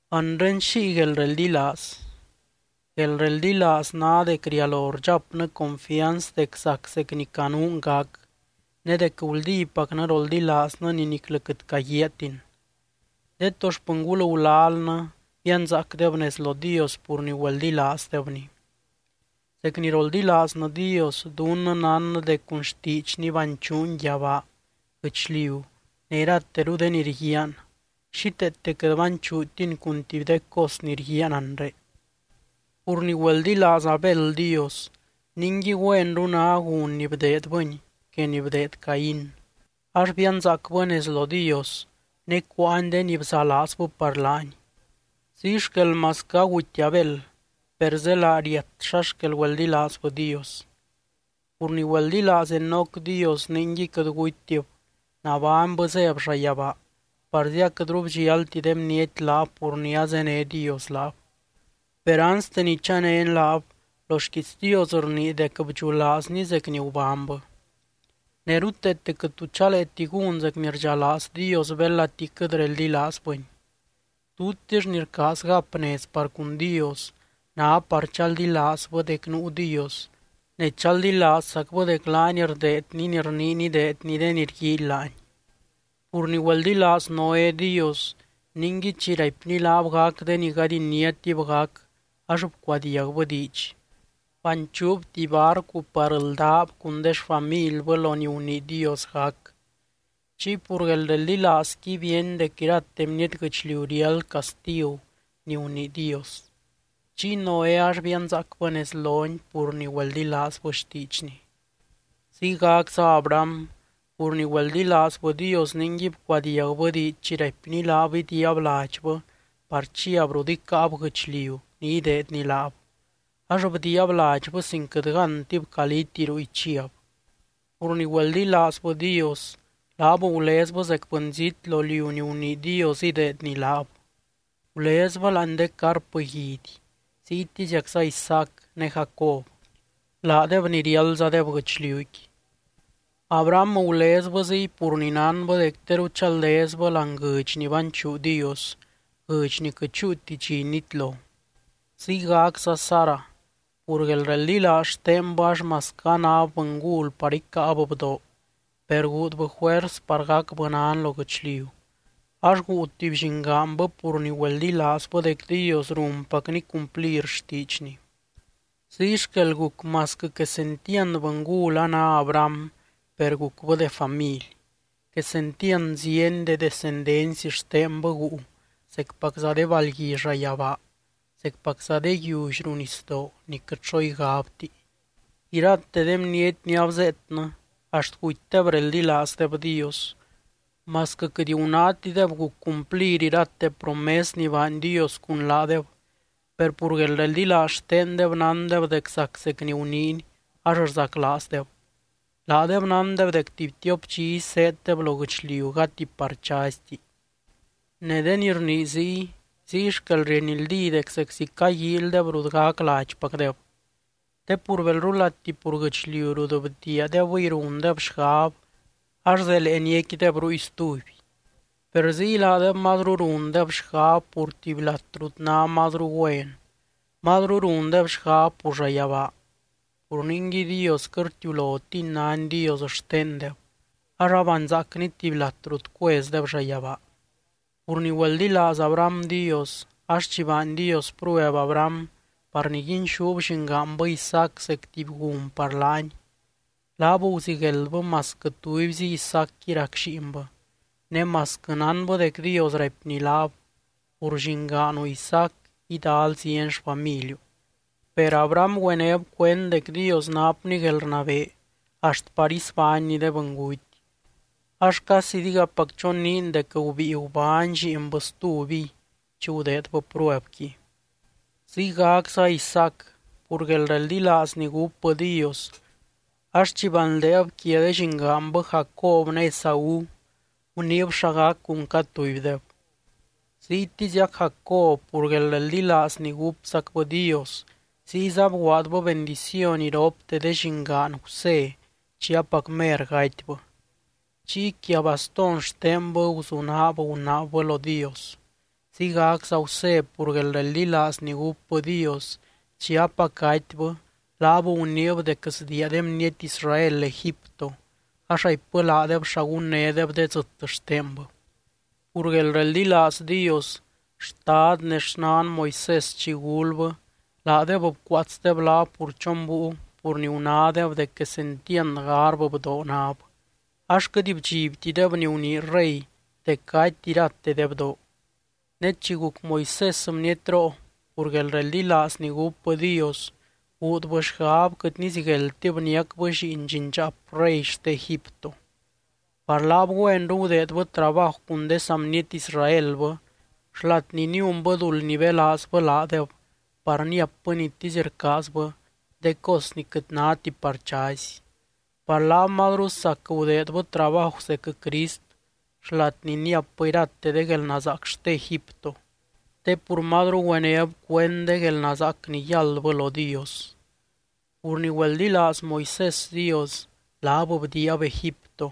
Anre, ¿xiy guelreldilaaz? Guelreldilaaz ná dec rialo rdxapnɨ confianz dec zac zec ni canuun gac, ne dec guldípacnɨ roldilaaznɨ ni niclɨ quɨt caguiaatin. De to xpɨngul gulalnɨ bianzaacdeb nez lo Dios pur ni güeldilaazdebny. Zec ni roldilaaznɨ Dios, dunnɨ nánnɨ dec cun xtiidxny banchuuny yabaa, guɨchliu ne irateru de ni rguiaan, xíteete quɨt banchuutiny cun tuby de cos ni rguiaan anre. Pur ni güeldilaaz Abel Dios ningui güenru ná gun ni bdeedbɨny que ni bdeed Caín, ax bianzaacbɨ nez lo Dios ne cuáany de ni bzalaazbɨ par laany. Ziy xquel masquɨ aguty Abel, per zélaa riat xa xquel güeldilaazbɨ Dios. Pur ni güeldilaaz Enoc Dios ningui quɨt gutytib, nabánybɨ zéb llayabaa parzi aquɨtru bdxialti de bniety laab pur ni azéne Dios laab. Per anste ni chanény laab, lo xquiits Dios rnii dec bdxulaazny zec ni gubánybɨ. Ne ruteete quɨt tu chaleeti gún zec ni rdxalaaz Dios belati quɨt reldilaazbɨny. Tutix ni rcaaz gap nez par cun Dios ná par chaldilaazbɨ dec nuu Dios, ne chaldilaazzacbɨ dec laany rdeedny ni rniiny ideedny de ni rguíily laany. Pur ni güeldilaaz Noé Dios ningui chi raipny laab gac de ni gady iniátib gac ax bcuadiagbɨ diidx, banchuub tuby barcu par ldáb cun de xfamilbɨ lo ni gunii Dios gac. Chiy pur guelreldilaazqui bíeny dec irate bniety guɨchliu riáld castigu ni gunii Dios, chiy Noé ax bianzaacbɨ nez lony pur ni güeldilaazbɨ xtiidxny. Ziygacza Abraham pur ni güeldilaazbɨ Dios ningui bcuadiagbɨ diidx chi raipny laab idiiab ladxbɨ par chiab rut icáab guɨchliu ni ideedny laab, ax bdiiab ladxbɨ sin quɨt gántib caliti ruy chiab. Pur ni güeldilaazbɨ Dios, laab gulezbɨ zec bɨnzít lo liu ni gunii Dios ideedny laab. Gulezbɨ láani de carp guidy, ziytiziacza Isaac ne Jacob, laadeb ni riáldzadeb guɨchliuqui. Abraham gulezbɨ ziy pur ni nánbɨ dec teru chaldezbɨ láani guɨdx ni banchuu Dios, guɨdx ni quɨt chúuti dxi nitlo. Ziygacza Sara, pur guelreldilaaz xtenbɨ ax masquɨ anáb bɨngul par icáab bdoo, per guudbɨ juers par gacbɨ nan lo guɨchliu ax guu tuby llingaanbɨ pur ni güeldilaazbɨ dec Dios runpacny cumplir xtiidxny. Ziy xquel guc masquɨ quesentiand bɨngul a ná Abraham per gucbɨ de family. Quesentiand zieny de descendency xtenbɨ guu zecpacza de balgui llayabaa, zecpacza de yiully ruu nisdoo ni quɨt xo igabti. Irate de bniety ni abzeetnɨ axt gutydeb reldilaazdeb Dios, masquɨ quɨt gunátideb guc cumplir irate promes ni baany Dios cun laadeb, per pur guelreldilaaz xtendeb nándeb dec zac zec ni guniiny ax rzaclaazdeb. Laadeb nándeb dec tuby tiop dxizy zéeddeb lo guɨchliu gati par chazyti. Ne de ni rnii ziy, ziy xquel rienldí dec zeczi caguíilydeb rut gac ladxpacdeb. Te pur belrulati pur guɨchliu rut bdiiadebɨy rundeb xgab, ax zelee niecquideb ruy stuby. Per ziy, laadeb mazru rundeb xgab pur tuby lat rut ná mazru güen, mazru rundeb xgab pur llayabaa. Pur ningui Dios quɨt rtiulotiny nány Dios xtendeb, ax abanzaacny tuby lat rut cuezdeb llayabaa. Pur ni güeldilaaz Abraham Dios ax chi baany Dios prueb Abraham par niguinxúb llingaanbɨ Isaac zec tuby gun par laany, laab guzigueldbɨ masquɨ tubyzi Isaacqui rac lliinbɨ, ne masquɨ nánbɨ dec Dios raipny laab: “Pur llingaanu Isaac idal zieny xfamiliu.” Per Abraham güenéb cuend dec Dios napny guelrnabee axt par isbánny de bɨnguty, ax casi digapac choniin dec gubíi gubány lliinbɨ stubiy chi gudeedbɨ pruebqui. Ziygacza Isaac pur guelreldilaaz ni gúpbɨ Dios ax chi banldeeb quia de llingaanbɨ Jacob ne Esaú, guniib xa gac cun cad tubydeb. Ziytiziac Jacob pur guelreldilaaz ni gúpzacbɨ Dios ziyza bguaadbɨ bendiciony iropte de llingaan Gusé chi apac mer gatybɨ. Chiy quia bastón xtenbɨ guzunaab gunaabbɨ lo Dios. Ziygacza Gusé pur guelreldilaaz ni gúpbɨ Dios, chi apac gatybɨ, laab guniib dec sdiia de bniety Israel Egipto, ax raipbɨ laadeb xa gunnédeb de dzɨt xtenbɨ. Pur guelreldilaaz Dios, xtad ne xnan Moisés chi gulbɨ, laadeb bcuaatsdeb laab pur chon búiu pur ni gunádeb dec quesentiand garbɨ bdoo náb, ax quɨt bdxibtideb ni gunii rey dec gaty irate de bdoo. Ne chi guc Moisés bnietroo, pur guelreldilaaz ni gúpbɨ Dios, guudbɨ xgab quɨt nizigueldtib niacbɨ lliin llindxaap rey xte Egipto. Par laab, güenru gudeedbɨ trabaju cun de saa bniety Israelbɨ, xlat ni niunbɨ duld nibelaazbɨ laadeb par níapbɨ nitisy rcaazbɨ, de cos ni quɨt náti par chazy. Par laab mazru sac gudeedbɨ trabaju zec Crist xlat ni níapbɨ irate de guelnazaac xte Egipto, te pur mazru güenéb cuend de guelnazaac ni yáldbɨ lo Dios. Pur ni güeldilaaz Moisés Dios, laab bdiiab Egipto,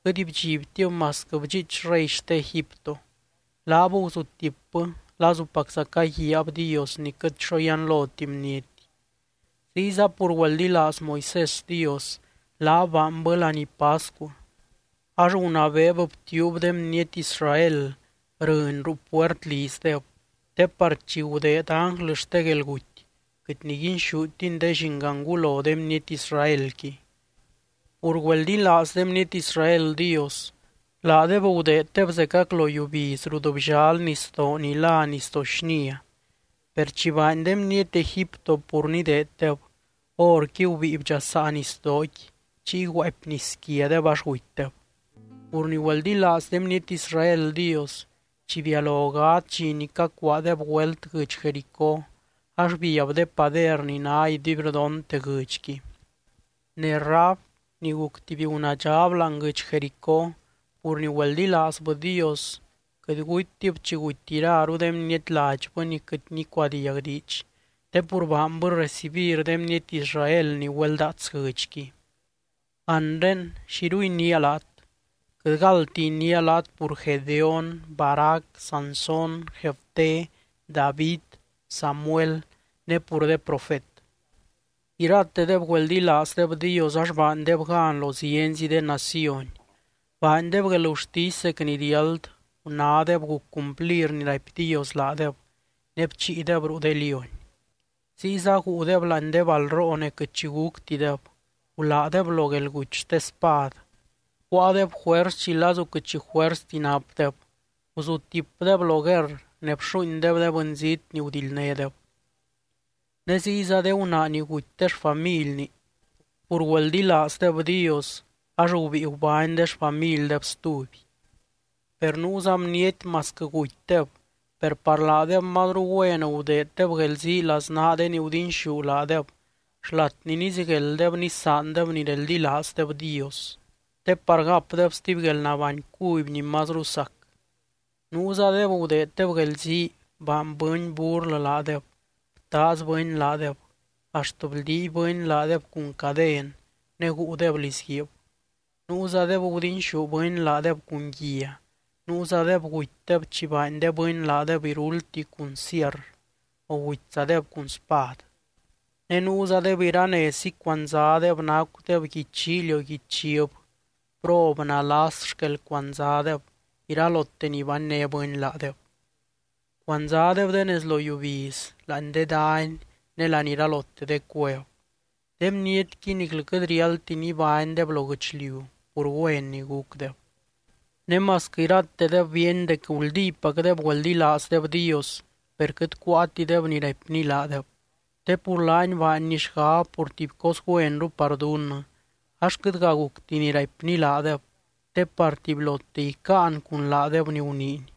quɨt bdxibtib masquɨ bdxiich rey xte Egipto. Laab guzutipbɨ lazupacza caguiaab Dios ni quɨt xo yianloti bniety. Ziyza pur güeldilaaz Moisés Dios, laab baanbɨ laní pascu, ax gunabeeb btiuub de bniety Israel rɨny ruu puert lizdeb, te par chi gudeed ánglɨ xte guelguty, quɨt niguinxútiny de llingangulo de bniety Israelqui. Pur güeldilaaz de bniety Israel Dios, laadeb gudeeddeb zecac lo yiubiz rut bllal nisdoo ni lá Nisdoo Xnia. Per chi baany de bniety Egipto pur nideeddeb, horqui gubíi bdxasaa nisdooqui chiy guaapy nis quiadeb ax gutydeb. Pur ni güeldilaaz de bniety Israel Dios, chi bialo gadz dxi ni cacuaadeb güelt guɨdx Jericó, ax biab de pader ni ná iduibrdonte guɨdxqui. Ne Rahab ni guc tuby gunaadxab láani guɨdx Jericó, pur ni güeldilaazbɨ Dios, quɨt gutytib chi guty iraru de bniety ladxbɨ ni quɨt nicuadiag diidx, te pur baanbɨ recibir de bniety Israel ni güeldaats guɨdxqui. Anre, ¿xiru iniia laat? Quɨt galdti iniia laat pur Gedeón, Barac, Sansón, Jefté, David, Samuel ne pur de profet. Iratedeb güeldilaazdeb Dios ax baandeb gan lo zienzi de naciony, baandeb guelgurtisy zec ni riáld, gunádeb guc cumplir ni raipy Dios laadeb ne bchiideb ruu de lióny. Ziyza guudeb láani balroo ne quɨt xi guctideb, guládeb lo guelguty xte spad, cuáadeb juers chi lazu quɨt xi juersti napdeb, guzutipdeb lo guerr ne bxuuindeb de bɨnzít ni gudildnédeb. Ne ziyza de gunaa ni guty de xfamilni, pur güeldilaazdeb Dios ax gubíi gubány de xfamildeb stuby. Per nuuza bniety masquɨ gutydeb, per par laadeb mazru güen gudeeddeb guelzii laznaa de ni gudinxú laadeb xlat ni niziguelddeb nisaandeb ni reldilaazdeb Dios, te par gapdeb stuby guelnabány cuby ni mazru sac. Nuuzadeb gudeeddeb guelzii baany bɨny burlɨ laadeb, btaaz bɨny laadeb, axt bldiiby bɨny laadeb cun caden ne guudeb lizguiib. Nuuzadeb gudinxú bɨny laadeb cun guia, nuuzadeb gutydeb chi baany de bɨny laadeb iruldti cun sierr, o gutyzadeb cun spad. Ne nuuzadeb iranezzi cuandzadeb nacudeb guidy llíily o guidy chiv, prob, nalas xquel cuandzadeb, iralote ni banné bɨny laadeb. Cuandzadeb de nez lo yiubiz, láani de dany, ne láani iralote de cuev. De bnietqui niclɨ quɨt riáldti nibánydeb lo guɨchliu pur güen ni gucdeb. Ne masquɨ iratedeb bíeny dec guldípacdeb güeldilaazdeb Dios, per quɨt cuáatideb ni raipny laadeb. Te pur laany baanny xgab pur tuby cos güenru par dunnɨ, ax quɨtga gucti ni raipny laadeb te par tubylote icáan cun laadeb ni guniiny.